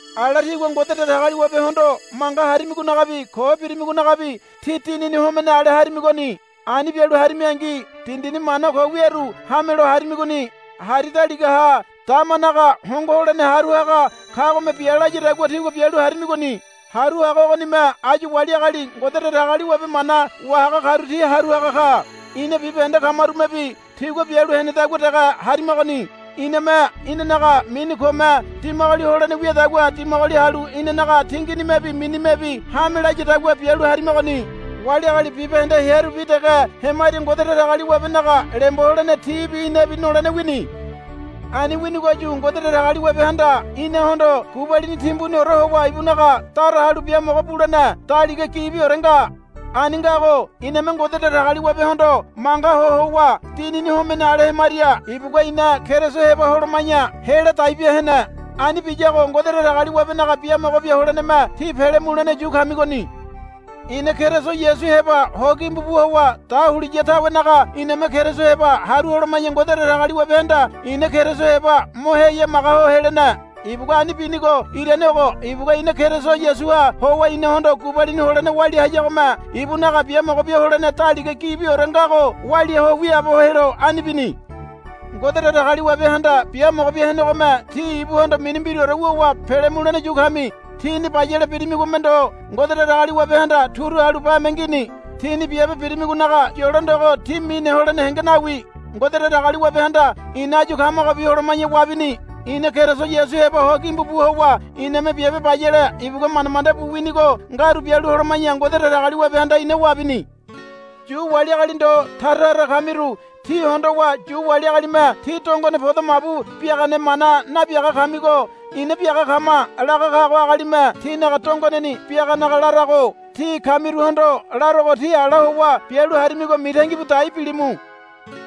Ala tígua Ngode Datagaliwabehondo manga harimigonagabi ko birimigonagabi tí dinini homene ale harimigoni. Ani bialu harimingi dindini mana ko wiaru hamelo harimigoni. Hari daligaha damanaga hongo holene haru haga kagome bia layadagua tígua bialu harimigoni. Haru haga ogonime áyu wali agali Ngode Datagaliwabe mana wahaga karu ti haru haga ka. Ina bibahende kamarumebi tigua bialu henedagua dege harimagoni. Iname inanaga mini kome dimagoli holene wiadagua dimagoli halu inanaga tinginimebi minimebi hame layadagua bialu harimagoni. Wali agali bibahende hearubi dege hemaria Ngode Datagaliwabenaga lembo holene tibi inabi nolene wini. Ani winigoyu Ngode Datagaliwabehanda inahondo gubalini timbuniore howa ibunaga dara halu biamogo bulene daliga gibiore nga. Ani ngago iname Ngode Datagaliwabehondo manga ho howa dinini homene ale hemaria ibugua ina Keriso heba holoma̱ya hela dai bia hene. Ani biyago Ngode Datagaliwabenaga biamogo bia holeneme tí pele mulene yu kamigoni. Ina Keriso Yasu heba ho gimbu bu howa dahuliya tawenaga iname Keriso heba haru holoma̱ya Ngode Datagaliwabehanda ina Keriso heba mo heyamaga ho helene. Ibugua ani binigo irane ogo. Ibugua ina Keriso Yasuha howa inahondo gubalini holene walia hayagome ibunaga biamogo bia holene daliga gibiore ngago walia ho wiaabo helo ani bini. Ngode Datagaliwabehanda biamogo bia henegome tí ibuhondo mini mbiraore wuwa pele mulene yu kami. Tíni bayale birimigome ndo Ngode Datagaliwabehanda turu halu bame ngini. Tíni biabe birimigonaga yolo ndogo tí mine holene henge nawi. Ngode Datagaliwabehanda ina áyu kamagobi holoma̱ya wabini. Ina Keriso Yasu heba ho gimbu bu howa iname biabe bayale ibugua manda manda bu winigo ngaru bialu holoma̱ya Ngode Datagaliwabehanda ina wabini. Yu wali agali ndo tara tara kamiru tí hondowa Yu wali agalime, Tí dongone podo mabu biagane mana nabiaga kamigo ina biaga kama, laga kago agalime tinaga dongoneni biaganaga larago. Tí kamiruhondo larogo tí ala howa bialu harimigo mitangi bu dai bilimu.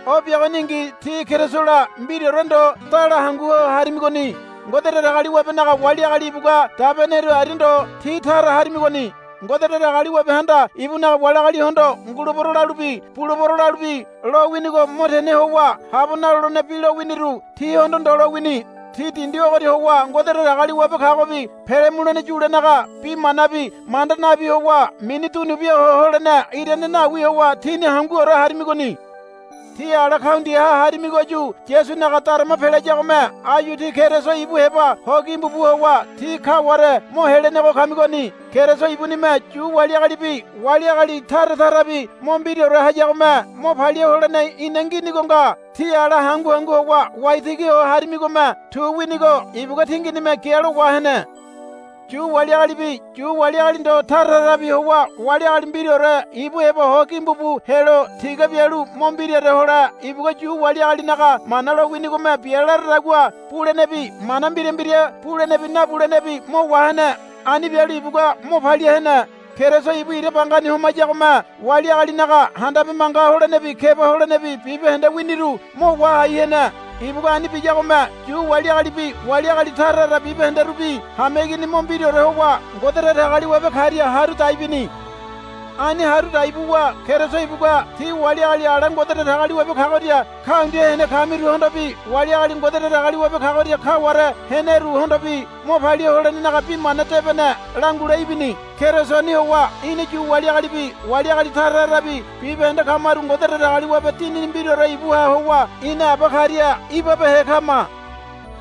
O biagoningi tí Kerisola mbiraore ndo dala hangu ho harimigoni. Ngode Datagaliwabenaga wali agali ibugua dabeneru aria ndo tí tara harimigoni. Ngode Datagaliwabehanda ibunaga wali agalihondo, Ngulebero, lalubi, Bulebero, lalubi lowinigo mo tene howa habo nalolene bi lowiniru tíhondo ndo lowini. Tí dindi ogoria howa Ngode Datagaliwabe kagobi pele mulene yulenaga bi manabi manda nabi howa mini dunu bia ho holene irane nawi howa tíni hanguore harimigoni. Tí ala kaundiaha harimigoyu Yasunaga darama pelayagome áyu tí Keriso ibu heba ho gimbu bu howa tí kaware mo helenego kamigoni. Keriso ibunime Yu wali agalibi wali agali tara tarabi mo mbiraore hayagome mo palia holene ina nginigo nga. Tí ala hangu hangu howa waitigi ho harimigome tu winigo ibugua tinginime gialo wahene. Yu wali agalibi Yu wali agali ndo tara tarabi howa wali agali mbiraore ibu heba ho gimbu bu helo tiga bialu mo mbiraore hole ibugua Yu wali agalinaga Mana lowinigome bia laradagua bulenebi mana mbira mbira bulenebi nabulenebi mo wahene. Ani bialu ibugua mo palia hene. Keriso ibu ira bangani homayagome wali agalinaga handabe manga holenebi keba holenebi bibahende winiru mo wahai hene. Ibugua ani biyagome Yu wali agalibi wali agali tara tara bibahenderubi hameigini mo mbiraore howa Ngode Datagaliwabe karia haru dai bini. Ani haru dai buwa Keriso ibugua tí wali agali ala Ngode Datagaliwabe kagoria kaundia hene kamiruhondobi wali agali Ngode Datagaliwabe kagoria kaware heneruhondobi mo palia holenenaga Bi Mana Debene langule ibini. Kerisoni howa ina Yu wali agalibi wali agali tara tarabi bibahende kamaru Ngode Datagaliwabe Dinini mbiraore ibuha howa ina Aba karia ibabehe kama.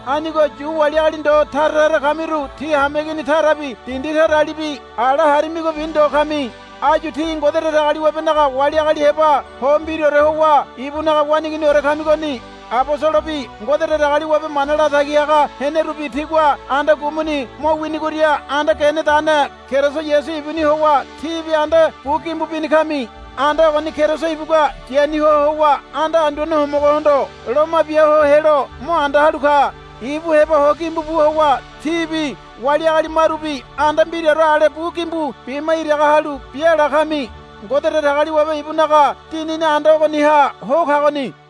Anigo Yu wali agali ndo tara tara kamiru tí hameigini tarabi dindi taralibi ala harimigobi ndo kami. Áyu tí Ngode Datagaliwabenaga wali agali heba ho mbiraore howa ibunaga waneiginiore kamigoni. Abosolobi Ngode Datagaliwabe mana latagi haga henerubi tigua anda gumuni mo winigoria anda genedane Keriso Yasu ibuni howa tíbi anda bu gimbu bini kami. Anda ogoni Keriso ibugua yani ho howa anda Anduane Homogohondo loma bia ho helo mo anda halu ka. Ibu heba ho gimbu bu howa tíbi wali agali marubi anda mbiraore ale bu gimbu bima iraga halu biala kami. Ngode Datagaliwabe ibunaga Dinini anda ogoniha ho kagoni.